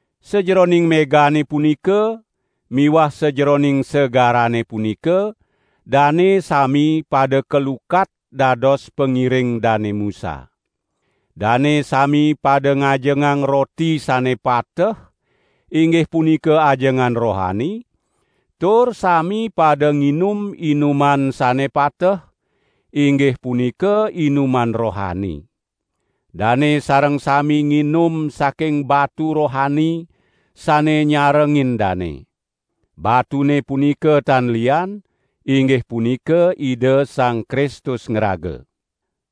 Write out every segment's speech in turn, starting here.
Sajeroning megane punika miwah sajeroning segarane punika dane sami pada kalukat dados pangiring Dane Musa. Dane sami pada ngajengang roti sane pateh, inggih punika ajengan rohani, tur sami pada nginum inuman sane pateh, inggih punika inuman rohani. Dane sareng sami nginum saking batu rohani sane nyarengin dane. Batune punika tan lian, inggih punika Ida Sang Kristus ngraga.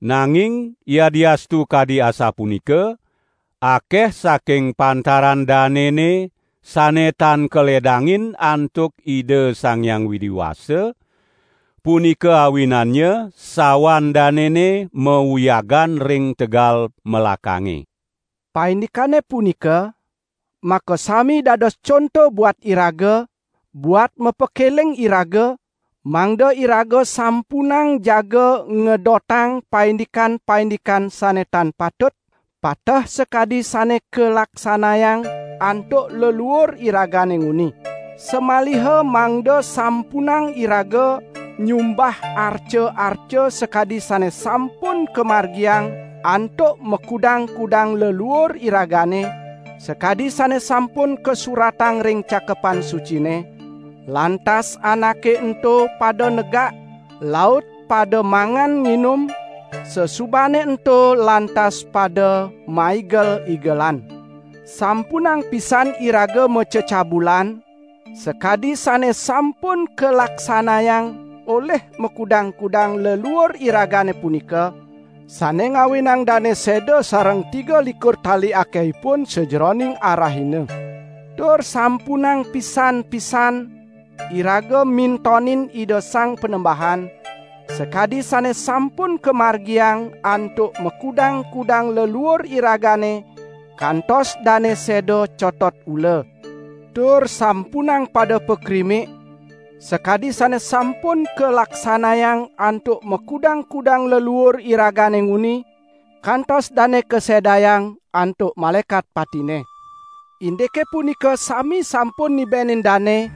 Nanging yadiastu kadi asapunika, akeh saking pantaran danene sane tan kaledangin antuk Ida Sang Hyang Widi Wasa, punika awinannya sawan danene mauyagan ring tegal melakange. Paindikane punika, makasami dados conto buat iraga, buat mapakeling iraga, mangda iraga sampunang jaga ngedotang paindikan-paindikan sane tan patut, pateh sakadi sane kalaksanayang antuk leluur iragane nguni. Samaliha mangda sampunang iraga nyumbah arca-arca sakadi sane sampun kamargiang antuk makudang-kudang leluur iragane, sakadi sane sampun kasuratang ring Cakepan Sucine: "Lantas anake ento pada negak laut pada mangan nginum; sasubane ento lantas pada maigel-igelan." Sampunang pisan iraga macecabulan sakadi sane sampun kalaksanayang olih makudang-kudang leluur iragane punika, sane ngawinang dane seda sareng tigalikur tali akehipun sajeroning arahina. Tur sampunang pisan-pisan iraga mintonin Ida Sang Panembahan, sakadi sane sampun kamargiang antuk makudang-kudang leluur iragane kantos dane seda cotot ula. Tur sampunang pada pakrimik, sakadi sane sampun kalaksanayang antuk makudang-kudang leluur iragane nguni, kantos dane kasedayang antuk Malaekat Patine. Indike punika sami sampun nibenin dane,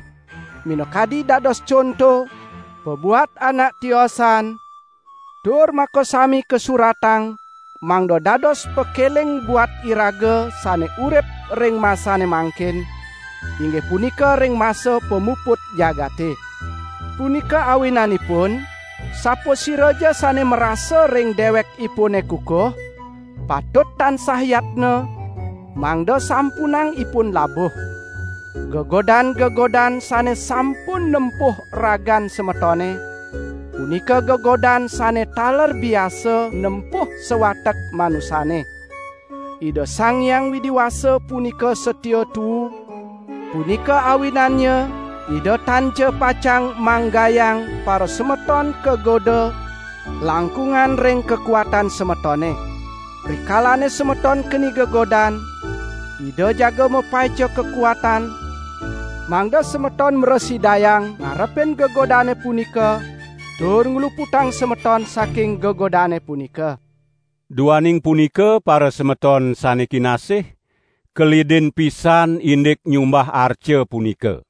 minakadi dados conto, pabuat anak tiosan, tur makasami kasuratang mangda dados pakeling buat iraga sane urip ring masane mangkin, inggih punika ring masa pamuput jagate. Punika awinanipun sapasiraja sane marasa ring dewekipune kukuh, patut tansah yatna, mangda sampunang ipun labuh. Gegodan-gegodan sane sampun nempuh ragan semetone, punika gegodan sane taler biasa nempuh sawatek manusane. Ida Sang Hyang Widi Wasa punika satia tuu, punika awinannya Ida tanja pacang manggayang parasemeton kagoda langkungan ring kakuatan semetone. Rikalane semeton keni gegodan, Ida jaga mapaica kakuatan, mangda semeton mrasidayang ngarepin gegodane punika tur ngluputang semeton saking gegodane punika. Duaning punika parasemeton sane kinasih, kelidin pisan indik nyumbah arca punika.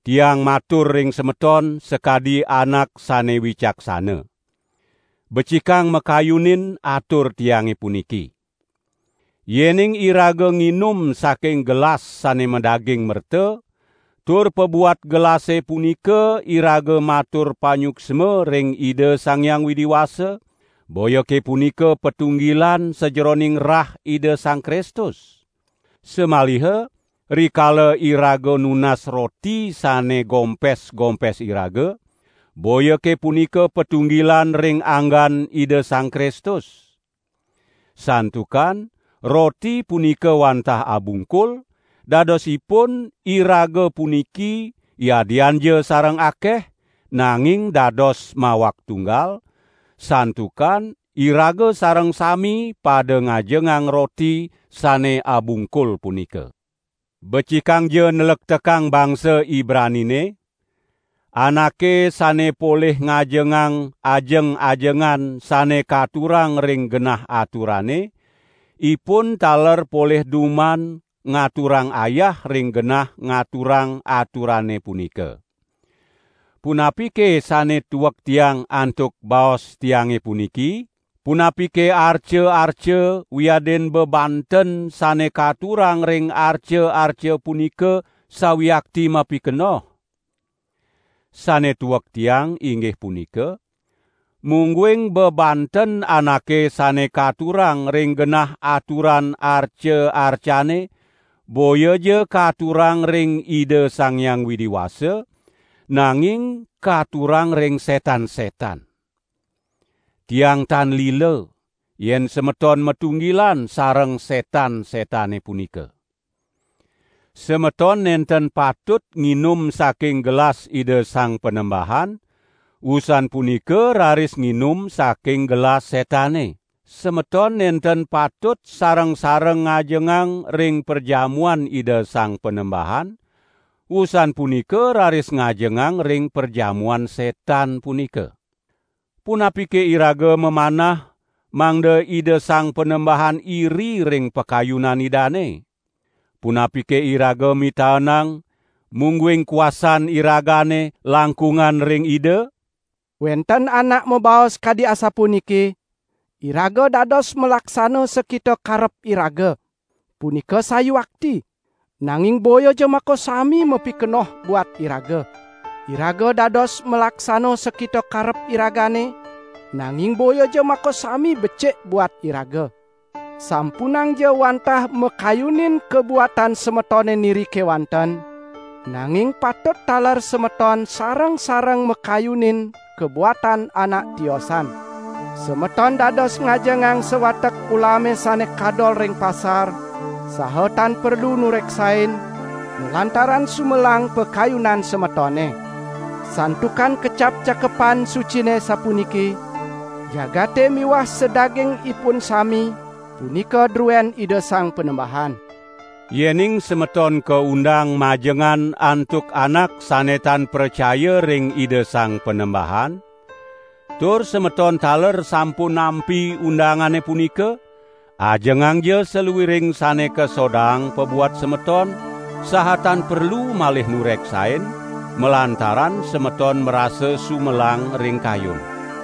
Tiang matur ring semeton sakadi anak sane wicaksana. Becikang makayunin atur tiange puniki! Yening iraga nginum saking gelas sane madaging merta, tur pabuat gelase punika iraga matur panyuksma ring Ida Sang Hyang Widi Wasa, boyake punika patunggilan sajeroning rah Ida Sang Kristus? Samaliha rikala iraga nunas roti sane gompes-gompes iraga, boyake punika patunggilan ring anggan Ida Sang Kristus? Santukan roti punika wantah abungkul, dadosipun iraga puniki yadianja sareng akeh, nanging dados mawak tunggal, santukan iraga sareng sami pada ngajengang roti sane abungkul punika. Becikangja nlektekang bangsa Ibranine: Anake sane polih ngajengang ajeng-ajengan sane katurang ring genah aturane, ipun taler polih duman ngaturang ayah ring genah ngaturang aturane punika. Punapike sane tuek tiang antuk baos tiange puniki? Punapike arca-arca wiadin bebanten sane katurang ring arca-arca punika sawiakti mapikenoh? Sane tuek tiang inggih punika: mungguing bebanten anake sane katurang ring genah aturan arca-arcane, boyaja katurang ring Ida Sang Hyang Widi Wasa nanging katurang ring setan-setan. Tiang tan lila, yen semeton matunggilan sareng setan-setane punika. Semeton nenten patut nginum saking gelas Ida Sang Panembahan, wusan punika raris nginum saking gelas setane. Semeton nenten patut sareng-sareng ngajengang ring perjamuan Ida Sang Panembahan, wusan punika raris ngajengang ring perjamuan setan punika. Punapike iraga mamanah mangda Ida Sang Panembahan iri ring pakayunan Idane? Punapike iraga mitaenang, mungguing kuasan iragane langkungan ring Ida? Wenten anak mabaos kadi asapuniki: "Iraga dados malaksana sakita karep iraga." Punika sawiakti, nanging boyaja makasami mapikenoh buat iraga. Iraga dados malaksana sakita karep iragane, nanging boyaja makasami becik buat iraga. Sampunangja wantah makayunin kabuatan semetone niri kewanten, nanging patut taler semeton sareng-sareng makayunin kabuatan anak tiosan. Semeton dados ngajengang sawatek ulame sane kadol ring pasar, saha tan perlu nureksain, malantaran sumelang pakayunan semetone. Santukan kecap Cakepan Sucine sapuniki: "Jagate miwah sadagingipun sami punika druen Ida Sang Panembahan." Yening semeton kaundang majengan antuk anak sane tan pracaya ring Ida Sang Panembahan, tur semeton taler sampun nampi undangane punika, ajengangja saluiring sane kasodaang pabuat semeton saha tan perlu malih nureksain malantaran semeton marasa sumelang ring kayun.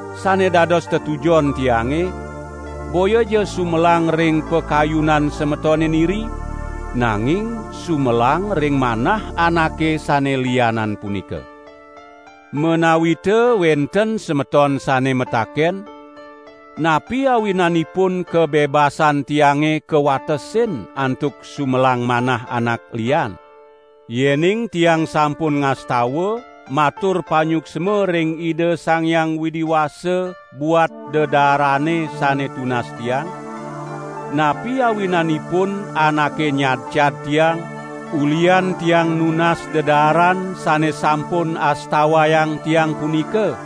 Sane dados tetujon tiange, boyaja sumelang ring pakayunan semetone niri, nanging sumelang ring manah anake sane lianan punika. Menawita wenten semeton sane mataken: "Napi awinanipun kabebasan tiange kawatesin antuk sumelang manah anak lian? Yening tiang sampun ngastawa matur panyuksma ring Ida Sang Hyang Widi Wasa buat dedaarane sane tunas tiang, napi awinanipun anake nyadcad tiang ulihan tiang nunas dedaaran sane sampun astawayang tiang punika?"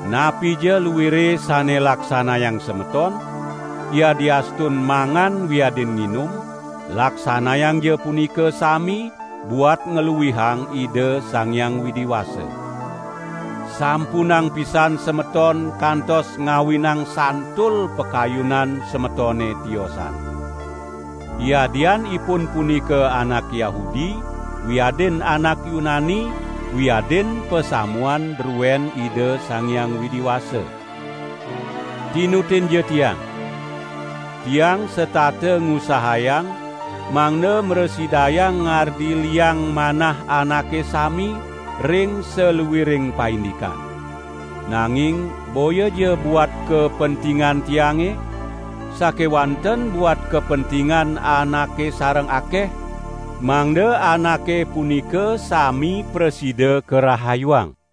Napija luire sane laksanayang semeton, yadiastun mangan wiadin nginum, laksanayangja punika sami buat ngluihang Ida Sang Hyang Widi Wasa. Sampunang pisan semeton kantos ngawinang santul pakayunan semetone tiosan. Yadian ipun punika anak Yahudi wiadin anak Yunani, wiadin pasamuan druen Ida Sang Hyang Widi Wasa. Tinutinja tiang! Tiang setata ngusahayang mangda mrasidayang ngardi liang manah anake sami ring saluiring paindikan. Nanging boyaja buat kapentingan tiange, sakewanten buat kapentingan anake sareng akeh, mangda anake punika sami prasida karahayuang!